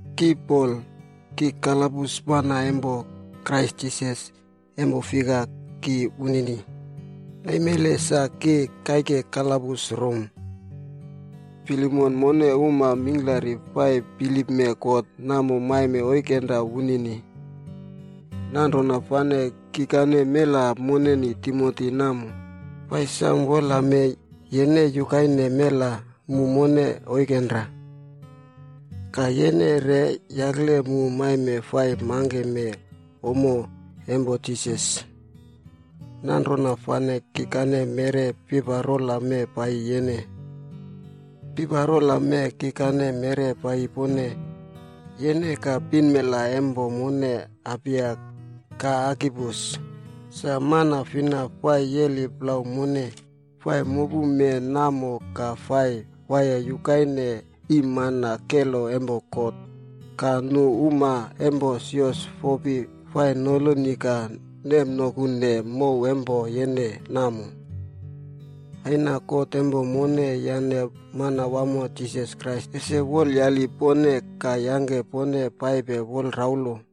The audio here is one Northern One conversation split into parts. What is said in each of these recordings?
Ki Pol, ki kalabus mana empo Krais Jisas empo fika, ki wunini. Naimele sa ki kaike kalabus Rom. Filemon mone uma mingklari fai bilipme God namo maime oikenra wunini. Nanrona fane kikane mela moneni Timoti namo, fai samo wolame yene yukaine mela mu mone oikenra. Ka yene re yakle mu maime fai mangkeme ommo empo Jisas. Nanrona fane kikane meꞌre piparola mee paiyi yene. Piparola mee kikane meꞌre paiyi pone: yene ka pinmela empo mone Apia, ka Arkipus, sa mana fina fai yeli plau mone fai mopume namo ka fai waiye yukaine iimmana kelo empo God, ka nu uma empo sios fopi fai noloni ka nemnokune mow empo yene namo. Aina God empo mone yane Manawamo Jisas Krais ese wolayali pone ka yangke pone paipe wolraulo.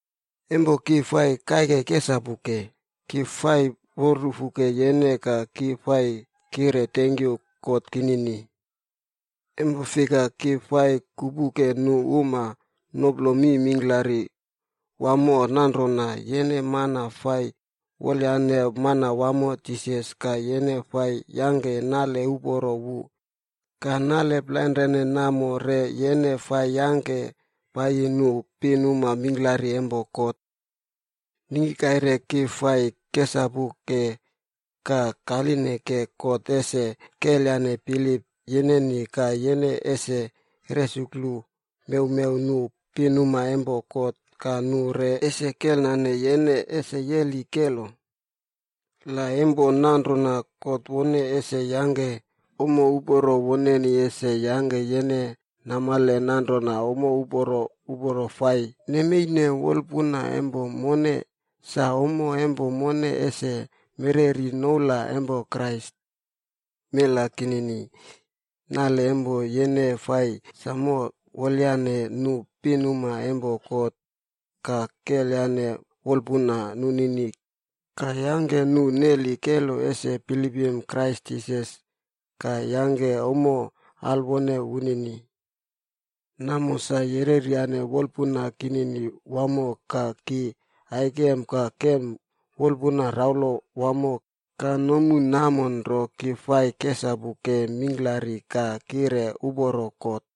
Empo ki fai kaike kesapuke, ki fai wolrufuke yene ka ki fai kire tenkyu God kinini. Empo fika, ki fai kupuke nu uma noplo mi mingklari wamo nanrona yene mana fai wolyane Manawamo Jisas ka yene fai yangke nale uporo wu, ka nale plainrane namo re yene fai yangke paiyi nu pinuma mingklari empo God. Ningki kaire ki fai kesapuke ka kalineke God ese kelyane bilip yeneni ka yene ese resuklu mewmew nu pinuma empo God ka nu re ese kelnane yene ese yeli kelo. La empo nanrona God wone ese yangke ommo uporo woneni ese yangke yene namale nanrona ommo uporo uporo fai nemeine wolpuna empo mone, sa ommo empo mone ese mereri noula empo Krais. Mela kinini, nale empo yene fai samo wolyaneye nu pinuma empo God ka kelyane wolpuna nunini ka yangke nu neli kelo ese bilipim Krais Jisas ka yangke ommo alwone wunini. Namo sa yereryane wolpuna kinini wamo ka ki aikem ka kem wolpuna raulo wamo ka nomu namo nro ki fai kesapuke mingklari ka kire uporo God.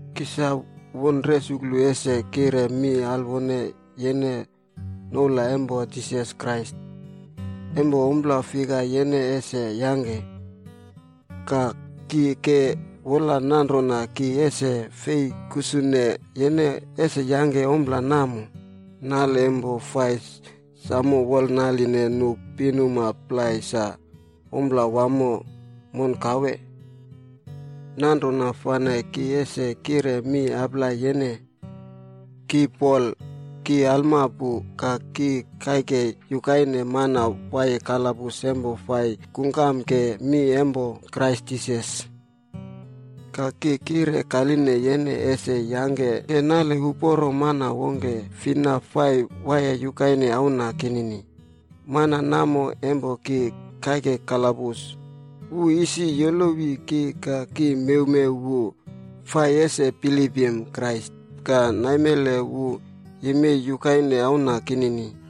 Ki sa won resuklu ese kire mi alwone yene noula empo Jisas Krais, empo ompla fika yene ese yangke. Ka, ki ke wola nanrona ki ese fei kusune yene ese yangke ompla namo. Nale empo fai samo wolnaline nu pinuma plai sa ompla wamo monkawe. Nanrona fane ki ese kire mi aplai yene. Ki Pol, ki alma pu ka ki kaike yukaine mana waiye kalabus empo fai kungkamke mi empo Krais Jisas. Ka ki kire kaline yene ese yangke nale uporo mana wongke fina fai waiye yukaine auna kinini, mana namo empo ki kaike kalabus, wu isi yolowi ki ka ki mewmew wu fai ese bilipim Krais ka naimele wu yemei yukaine auna kinini.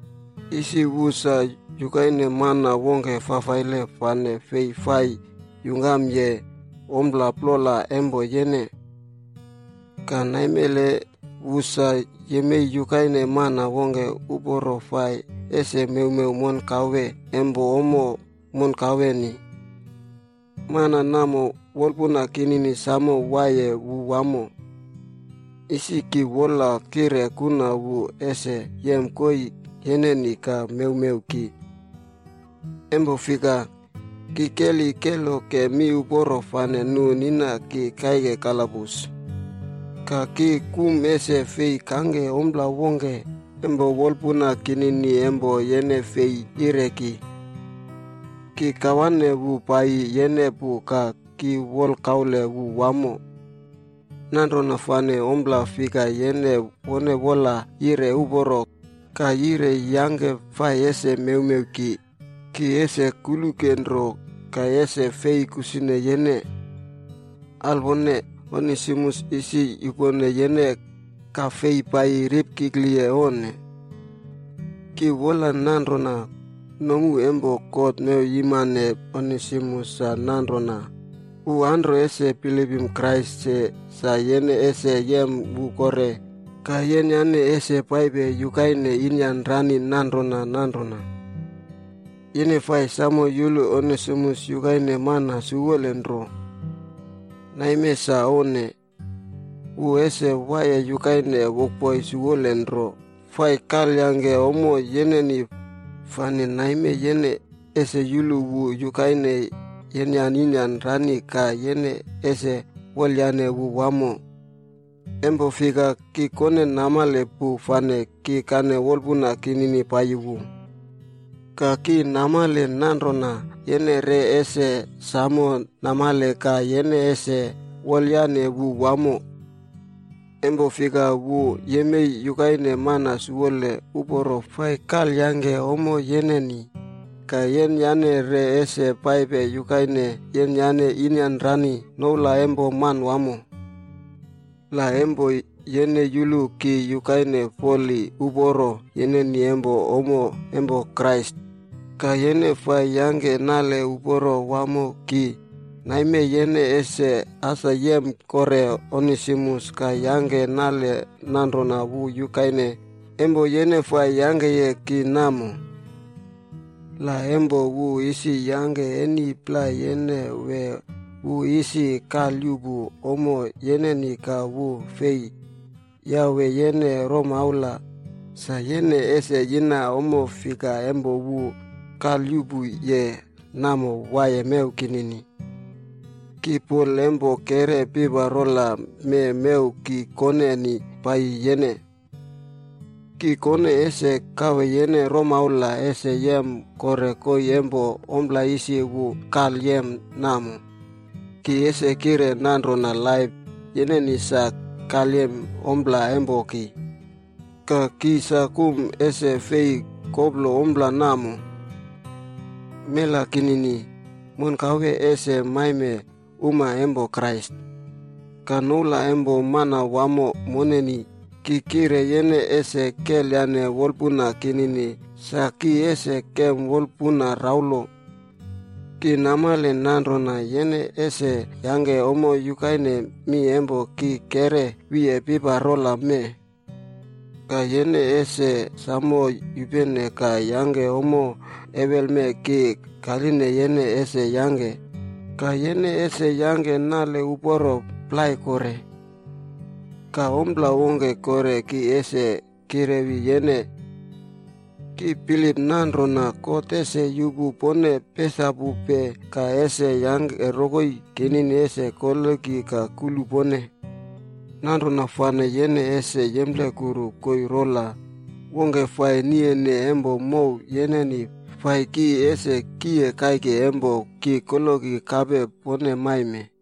Isi wu sa yukaine mana wongke fafaile fane fei fai yungkamye ommo plola empo yene. Ka naimele wu sa yemei yukaine mana wongke uporo fai ese mewmew monkawea empo ommo monkaweni. Mana namo, wolpuna kinini samo waiye wu wamo. Isi ki wola kire kuna wu ese yem koii yeneni ka mewmew ki. Empo fika, ki keli keloke miuporo fane nu nina ki kaike kalabus. Ka ki kum ese fei kangke ompla wongke empo wolpuna kinini empo yene fei yire ki. Ki kawane wu paiyi yene pu ka ki wolkaule wu wamo. Nanrona fane ompla fika yene wone wola yire uporo ka yire yangke fai ese mewmew ki, ki ese kuluke nro ka ese fei kusune yene. Alwone, Onesimus isi yupone yene ka fei paiyi ripkikliye onne. Ki wola nanrona, nomu empo God mewyimane Onesimus sa nanrona, wu anro ese bilipim Krais se sa yene ese yem wu kore ka yenyane ese paipe yukaine inyanrani nanrona nanrona. Yene fai samo yulu Onesimus yukaine mana siwole nro. Naime sa onne. Wu ese waiye yukaine wokboi siwole nro fai kalyangke ommo yeneni, fane naime yene ese yulu wu yukaine yenyane inyanrani ka yene ese wolyane wu wamo. Empo fika, ki kone namale pu fane ki kane wolpuna kinini paiyi wu. Ka ki namale nanrona yene re ese samo namale ka yene ese wolyane wu wamo. Empo fika wu yemei yukaine mana siwole uporo fai kalyangke ommo yeneni, ka yenyane re ese paipe yukaine yenyane inyanrani noula empo Manawamo. La empo yene yulu ki yukaine foli uporo yeneni empo ommo empo Krais ka yene fai yangke nale uporo wamo ki, naime yene ese as yem kore Onesimus ka yangke nale nanrona wu yukaine empo yene fai yangkeye ki namo. La empo wu isi yangke eni plai yene wee wu isi kalyuꞌpu ommo yeneni ka wu fei yawe yene romaula, sa yene ese yina ommo fika empo wu kalyuꞌpuye namo waiye mew kinini. Ki Pol empo keꞌre piparola mee mew ki koneni paiyi yene. Ki kone ese kawe yene romaula ese yem kore koii empo ompla isi wu kalyem namo. Ki ese kire nanrona laip yeneni sa kalyem ompla empo ki.b Ka ki sa kum ese fei koplo ompla namo. Mela kinini, monkawe ese maime uma empo Krais. Ka noula empo Manawamo moneni, ki kire yene ese kelyane wolpuna kinini sa ki ese kem wolpuna raulo. Ki namale nanrona yene ese yangke ommo yukaine mi empo ki keꞌre wiye piparola mee. Ka yene ese samo yupene ka yangke ommo ewelme ki kaline yene ese yangke, ka yene ese yangke nale uporo plai kore. Ka ompla wongke kore ki ese kirewi yene. Ki bilip nanrona God ese yupu pone pesapupe ka ese yangke rokoi kinini ese koloki ka kulu pone. Nanrona fane yene ese yemplekuru koii rola wongke fai niyene empo mow yeneni fai ki ese kiye kaike empo ki koloki kape pone maime.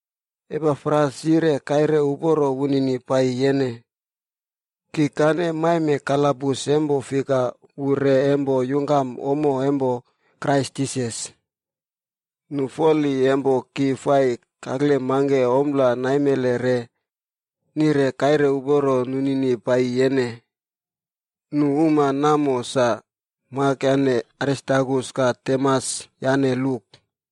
Epafras yire kaire uporo wunini paiyi yene. Kikane maime kalabus empo fika wu re empo yungkam ommo empo Krais Jisas. Nu foli empo ki fai kakle mangke ommo naimele re, nire kaire uporo nunini paiyi yene. Nu uma namo sa: Mak yane Aristarkus ka Demas yane Luk.